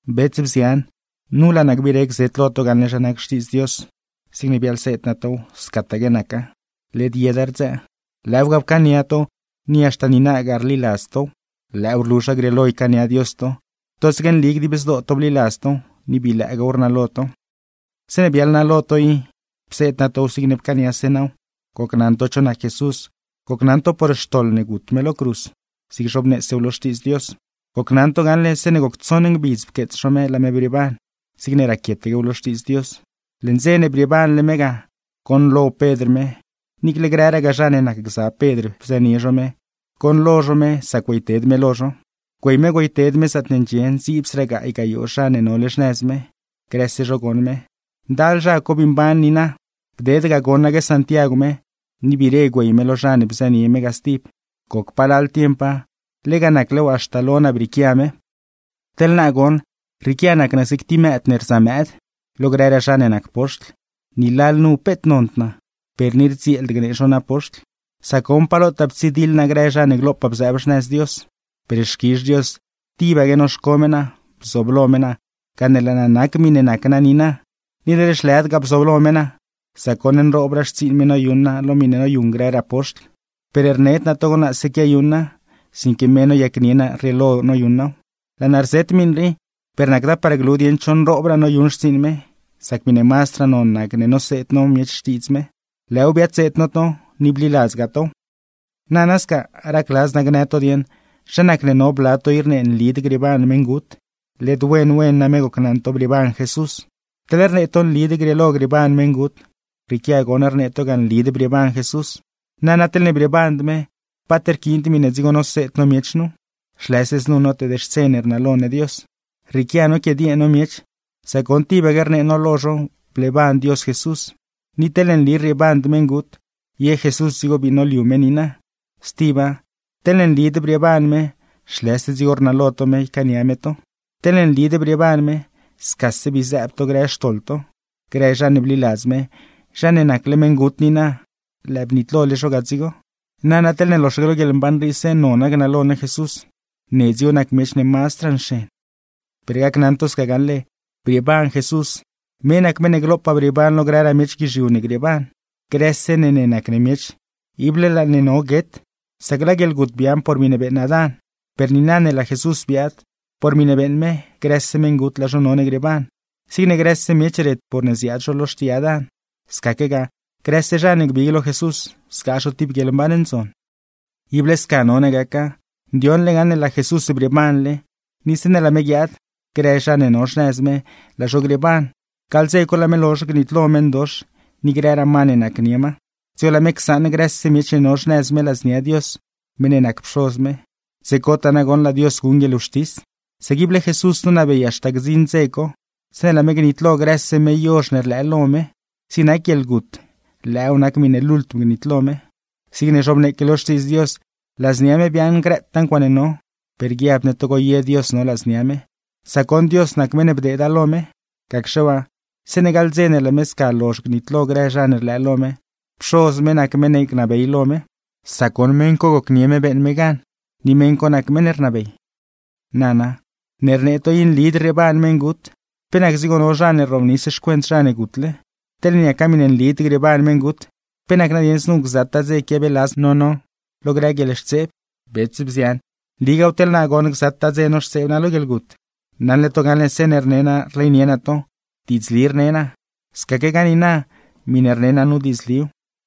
Bets, bzian, nu laa naa gbire gzet lo to gaṉle zha nac Xtiidz Dios. Zigne biaḻseed naa tow, scataque naca; led yeda rdzëë. Lëëw ga pcaania to, ni haxta niinagaa rliladz tow. Lëëw rlu zha grieelo ycaania Dios to, totsaque nli dib zdoo to bliladz tow, ni bii lëëgaaw rnalo to. Zeeṉe biaḻ naa lo to i, pseed naa tow zigne pcaaniase naaw. Gocnaṉ to cho nac Jesús, gocnaṉ to por xtoḻ ne gut me lo cruz, zigne zhobneesew lo Xtiidz Dios. Gocnaṉ to gaṉle zeeṉe goc tsoṉ ngbidz pqueets zho me laa me brieeban, zigne raquietaquew lo Xtiidz Dios. Leṉ dze ne brieebanle me ga, goṉlo Pedr me, niicle grëragaa zha ne nacgza Pedr bzënie zho me, goṉlo zho me sac güeyted me lo zho. Güey me güeyted me zaatne ndxie ndziibsraa gaay gayoo zha ne nole xnëz me, grëse zho goṉ me; ndal zha co bii mban niina. Bded ga goṉaque Santiagw me, ni biire güey me lo zha ne bzënie me ga stib; goc palal tiempa, lega naclew haxta lo naa brieequia me. Teḻ naa goṉ, rrieequia nac naa zig tib mëëd ne rzamëëd, lo grëraa zha ne nac poxtl, ni lalnu peet nond naa, per ni rdzieeld gnee zho naa poxtl; sac goṉ pa lotaa ptsidiḻ naa grë zha ne glopaa bzëëb xnëz Dios. Per xquizh Dios tibaque noxco me naa, bzooblo me naa gane laa naa nac miṉe nac naa niina. Ni led zhlëdgaa bzooblo me naa, sac goṉ nroobraa xtsiiṉ me noyuṉ naa lo miṉe noyuṉ grëraa poxtl; per rned naa togo naase quiayuṉa, sinque me noyacnie naa rrieelo noyuṉ naaw. Laa naa rzet miṉ rii, per nacda par glu dieṉ cho nroobraa noyuṉ xtsiiṉ me, sac miṉe mazdraa non nac ne noseed no miech Xtiidz me; lëëw biadseed no to, ni bliladzdgaa tow. Nana sca, racladz naa gnë to dieṉ zha nacne no bla to i rnee nlid grieeban meṉgut; led wen wen name gocnaṉ to brieeban Jesús. Teḻne rnee to nlid grieelo grieeban meṉgut, rrieequia goṉ rnee to ga nlid brieeban Jesús. Nana teḻne brieeband me, paat rquiind miṉe dzigo noseed no miech nu, zhlëse znu noteed-xtse ne rnalo ne Dios. Rrieequia noquidiee no miech, sac goṉ tibaque rnee no lo zho bleeban Dios Jesús; ni teḻne nli rrieeband meṉgut, ye Jesús dzigo bii noliu me niina. Stiba, teḻne nlid brieeban me, zhlëse dzigo rnalo to me ycaania me to; teḻne nlid brieeban me, scase bii zëëb to grë xtoḻ to. Grë zha ne bliladz me, zha ne nacle meṉgut niina, lëë bnitlole zho ga dzigo. Nana teḻne loxaque lo guieḻmban riise nona gnalo ne Jesús, ne dzigo nac miech ne mazdraa nxen. Per gacnaṉ to sca gaṉle, ¡brieeban Jesús! Me nac meṉ ne glopaa brieeban lo grëraa miech guizhiu ne grieeban. Grëse ne ne nac ne miech, ible laa ne none guet; sac laa guieḻgut biaaṉ por miṉe beeṉ Adán; per niina ne laa Jesús biaad, por miṉe beeṉ me grëse meṉgut laa zho none grieeban. Zigne grëse miech ret porne ziaad zho lo xtii Adán, scaquegaa grëse zha ne gbig lo Jesús, zgaa zho tib guieḻmban ndzon. Ible sca none gaca, ndioṉ ne gaṉle laa Jesús brieebanle, ni zeeṉe laa me guiaad, grë zha ne no xnëz me laa zho grieeban. Gaḻ dze co laa me lozh gnitlo meṉdox ni grëraa ma ne nacnie ma, dzigo laa me csaṉ grëse miech ne no xnëz me ladznia Dios meṉ ne nac Pxoz me; dze cotaa nagoṉ laa Dios guṉ guieḻwxtis. Sac ible Jesús nonabey haxta gdziṉ dze co, zeeṉe laa me gnitlo grëse meyozh ne rlëë lo me; zig nac guieḻgut, lëëw nac miṉe lultm gnitlo me. Zigne zhobneeque lo Xtiidz Dios, ladznia me biaaṉ grëtaa ncuaaṉe no; per guiabd ne togo ye Dios no ladznia me, sac goṉ Dios nac meṉ ne bdeeda lo me. Gacxe waa, zeeṉe gaḻ dze ne laa me sca lozh gnitlo grë zha ne rlëë lo me, Pxoz me nac meṉ ne gnabey lo me; sac goṉ meṉ co gocnie me beeṉ me gan, ni meṉ co nac meṉ ne rnabey. Nana, ne rnee to i nlid rrieeban meṉgut, ¿pe nac dzigo no zha ne rrobnis xcuent zha ne gutle? Teḻne niaca miṉe nlid grieeban meṉgut, ¿pe nac nadieṉ znu gzataa dze quiabeeladz no no lo grë guieḻxtseeb? Bets, bzian, nligaaw teḻ naa goṉ gzataa dze noxtseeb naa lo guieḻgut; naṉle to gaṉle zeeṉe rne naa rleynie naa to, diidzli rnee naa; scaquegaa niina, miṉe rnee naa nu diidzliw.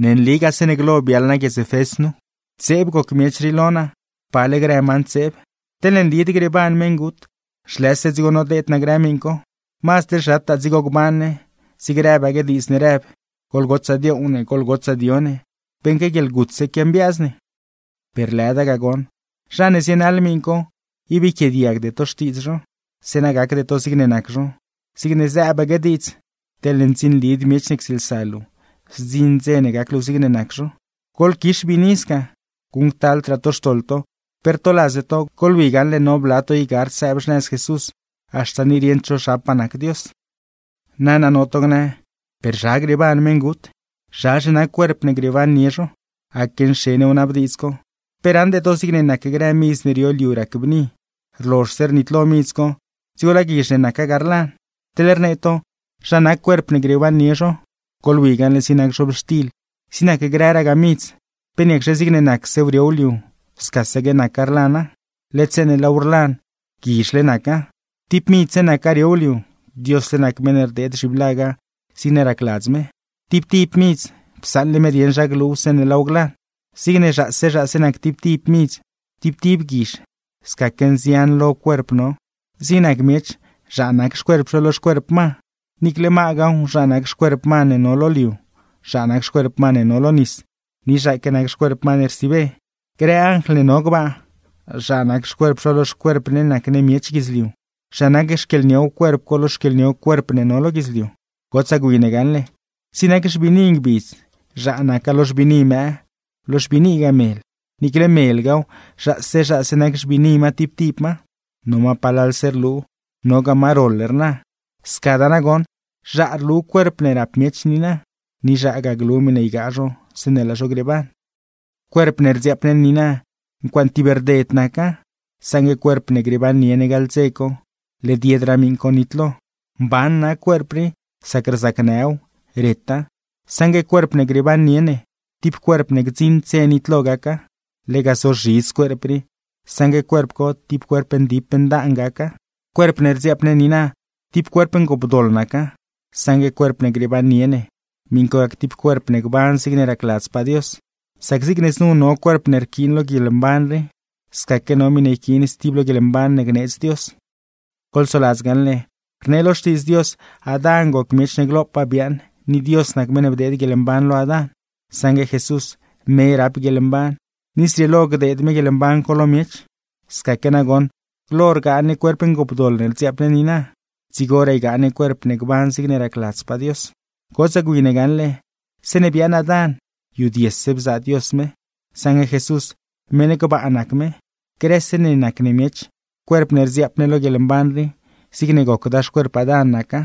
Ne nligaa zeeṉe glo biaḻ naa guiedz Efés nu, ntseeb goc miech rii lo naa, pale grë ma ntseeb. Teḻne nlid grieeban meṉgut, zhlëse dzigo nodeed naa grë miṉ co; mazd teḻ zhataa dzigo gban ne, zigne rëbaque diidz ne rëb: “¡Goḻgotsaa dioow ne, goḻgotsaa dio ne, beṉque guieḻgutse quiambiaaz ne!” Per lëda ga goṉ. Zha ne zienaḻ miṉ co, ib yquiaadiagde to xtiidz zho, zeeṉa gacde to zigne nac zho; zigne zëëbaque diidz: “Teḻne ndzinlid miech ne ctsieelsa luu, zdziṉ dze ne gac luu zigne nac zho.” Goḻquix biini sca, guṉctaldraa to xtoḻ to; pe rtoladzde to, goḻwi gaṉle no bla to i gard sëëb xnëz Jesús, haxta ni rieṉd zho zhapaa nac Dios. Nana, no to gnë: “¿Per zha grieeban meṉgut? ¿Zhazhe nac cuerp ne grieebannie zho?” ¡Aque nxen wnabdiidz co! ¿Pe raṉde to zig nac grë midz ne rio liu rac bni, rlozhse rnitlo midz co dzigo laa guizh ne naca ga rlan? Teḻ rnee to zha nac cuerp ne grieebannie zho, goḻwi gaṉle zig nac zhobxtil, zig nac grëragaa midz, ¿pe niacxe zigne nacsew riow liu, scasaque naca rlana? Led zeeṉe laaw rlan, guizhle naca. Tib midzse naca riow liu, Diosle nac meṉ ne rdeed zhiblaga zigne racladz me. Tib tib midz, psaṉle me dieṉ zha gluw zeeṉe laaw glan. Zigne zhaase zhaase nac tib tib midz, tib tib guizh, scaque nzian lo cuerp no. Zig nac miech, zhaa nac xcuerp zho lo xcuerp ma, niicle magaaw, zhaa nac xcuerp ma ne no lo liu, zhaa nac xcuerp ma ne no lo nis, ni zhaaque nac xcuerp ma ne rsiibe. Grë anjl ne no gbaa, zhaa nac xcuerp zho lo xcuerp ne nac ne miech guidzliu; zhaa nac xquieḻniow cuerp co lo xquieḻniow cuerp ne no lo guidzliu. Gotsaa gwi ne gaṉle, zig nac xbiini ngbidz zhaa naca lo xbiini mëë, lo xbiinigaa mel. Niicle melgaaw, zhaase zhaase nac xbiini ma tib tib ma, no ma palalse rlu, nogaa ma roḻ rna. Scadaa nagoṉ, zhaa rlu cuerp ne rap miech niina, ni zhaagaa glu miṉe ygaa zho zeeṉe laa zho grieeban. Cuerp ne rdziaap ne niina, ncuaaṉe tib rded naca, saṉgue cuerp ne grieebannie ne gaḻ dze co, led yedraa miṉ co nitlo. Mban nac cuerp rii, sac rzacnëw, reta; saṉgue cuerp ne grieebannie ne, tib cuerp ne gdziṉd dze nitlo gaca. Lega zozhidz cuerp rii, saṉgue cuerp co tib cuerp ndip ndaan gaca. Cuerp ne rdziaap ne niina, tib cuerp ngoopdoḻ naca, saṉgue cuerp ne grieebannie ne, miṉ co gac tib cuerp ne gban zigne racladzpaa Dios. Sac zigne znu no cuerp ne rquiin lo guieḻmban rii, scaquegaa no miṉe yquiin stib lo guieḻmban ne gneedz Dios. Goḻsoladz gaṉle, rnee lo Xtiidz Dios Adán goc miech ne glopaa biaaṉ ni Dios nac meṉ ne bdeed guieḻmban lo Adán; saṉgue Jesús, me rap guieḻmban, ni zrieelo gdeed me guieḻmban co lo miech. Scaque nagoṉ, glo rgaa ne cuerp ngoopdoḻ ne rdziaap ne niina, dzigoraa ygaa ne cuerp ne gban zigne racladzpaa Dios. Gotsaa gwi ne gaṉle, zeeṉe biaaṉ Adán yudiese bzaa Dios me; saṉgue Jesús, meṉ gbaa nac me. Grëse ne nac ne miech, cuerp ne rdziaap ne lo guieḻmban rii, zigne gocdaa xcuerp Adán naca;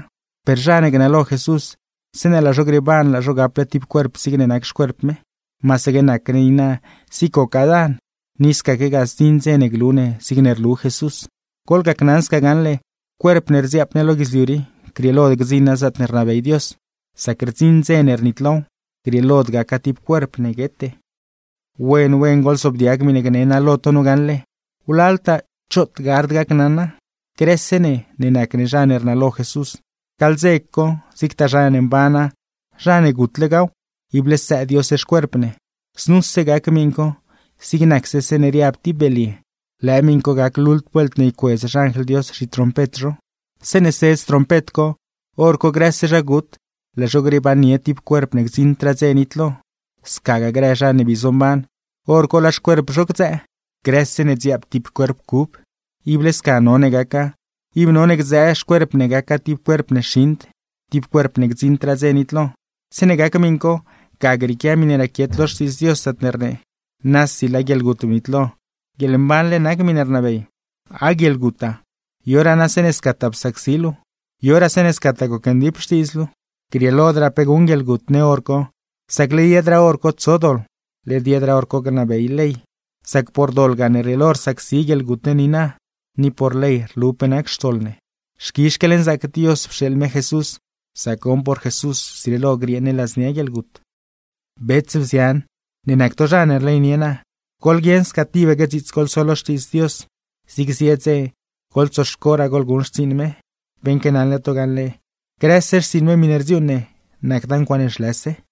per zha ne gnalo Jesús, zeeṉe laa zho grieeban laa zho gaple tib cuerp zigne nac xcuerp me. Masaque nac ne niina zigne goc Adán, ni scaquegaa zdziṉ dze ne glu ne zigne rlu Jesús. Goḻgacnaṉ sca gaṉle, cuerp ne rdziaap ne lo guidzliu rii, grieelod gdziṉa zaatne rnabey Dios; sac rdziṉ dze ne rnitlow, grieelod gaca tib cuerp ne guete. Wen wen goḻzoobdiag miṉe gne naa lo to nu gaṉle, wlaltaa choot gard gacnaṉa: Grëse ne ne nac ne zha ne rnalo Jesús, gaḻ dze co zigtaa zha ne mbana, zha ne gutlegaaw ible stsëë Dios xcuerp ne. Znuse gac miṉ co zig nacse zeeṉe riab tib belye; lëë miṉ co gac lultm vuelt ne ycuedz xanjl Dios zhitrompet zho. Zeeṉe sedz trompet co, hor co grëse zha gut, laa zho grieebannie tib cuerp ne gdziṉdraa dze nitlo; scagaa grë zha ne bii zomban, hor co laa xcuerp zho gdzëë. ¡Grëse ne dziaap tib cuerp cub! Ible sca none gaca, ib none gdzëë xcuerp ne gaca tib cuerp ne xiṉd, tib cuerp ne gdziṉdraa dze nitlo. Zeeṉe gac miṉ co, ga grieequia miṉe raquiet lo Xtiidz Dios zaatne rnee: “Nasi laa guieḻgut bnitlo, guieḻmbanle nac miṉe rnabey. Ah guieḻguta, ¿yoraa na zeeṉe scataa psacsi luu? ¿Yoraa zeeṉe scataa gocndip xtiidz luu?” Grieelodraa pe guṉ guieḻgut ne hor co, sac led yedraa hor co tso doḻ, led yedraa hor co gnabey ley; sac por doḻ gane rrieelo rsacsi guieḻgut ne niina, ni por ley rlu pe nac xtoḻ ne. ¡Xquizh xquieḻnzaac Dios pxeeḻ me Jesús, sac goṉ por Jesús zrieelo griee ne ladznia guieḻgut! Bets, bzian, ne nac to zha ne rleynie naa, goḻguieṉ sca tibaque dziits goḻso lo Xtiidz Dios; zig zie dze goḻtsoxcoraa goḻguṉ xtsiiṉ me, beṉque naṉle to gaṉle, grëse xtsiiṉ me miṉe rdziuuṉ ne nacda ncuaaṉe zhlëse.